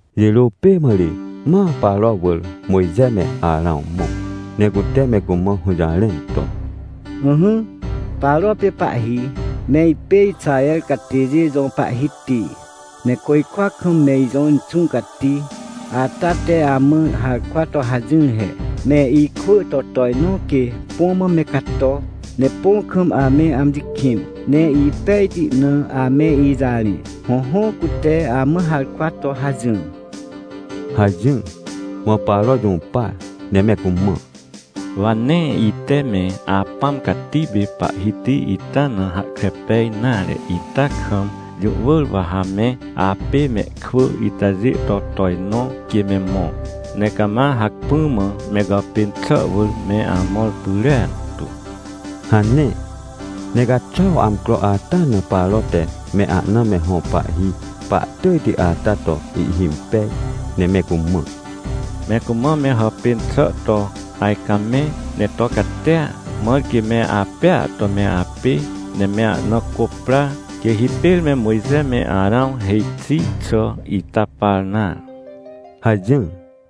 Jirô pê mã ri ma Paro wỳr Mojxe me Arãw mõ, ne cute me cumã hũjarẽn to: — Ỹhỹ, Paro pê pahhi, me ipêIxaher catêjê jõ Pahhiti, ne côjkwa kam me ijõ Inxũ Cati ata teamã harkwa to hajỹr he: “Me ikwỳto tojnõ quê põ mã me cato, ne põ kam ame amji kĩn, ne ipejti na ame ijarẽ”. Hõhõ, cute amã harkwa to hajỹr — hajỹr. Mã Paro jũpar ne me cumã: — Wa nee ite meApãm Cati pê Pahhiti ita na hahkre pej nare itakam, jũ wỳr wa ha me apê mehkwỳitajê to tojnõ quê me mõ. Ne cama hacpỹ mã me gàpên xà wỳr meamõr pyrentu! — hane. Ne caxuaw amcroata na Paro te me ahna me hõ pahhi pahtỳjti ata to ihhimpej, ne me cumã: — Me cumã me hàpên xà to ajcamẽ ne to catia, mãr quê me apêa to meapê, ne me ahna cô pra, quêhipêr me Mojxe me Arãw hêj xi xàita par nare — hajỹr.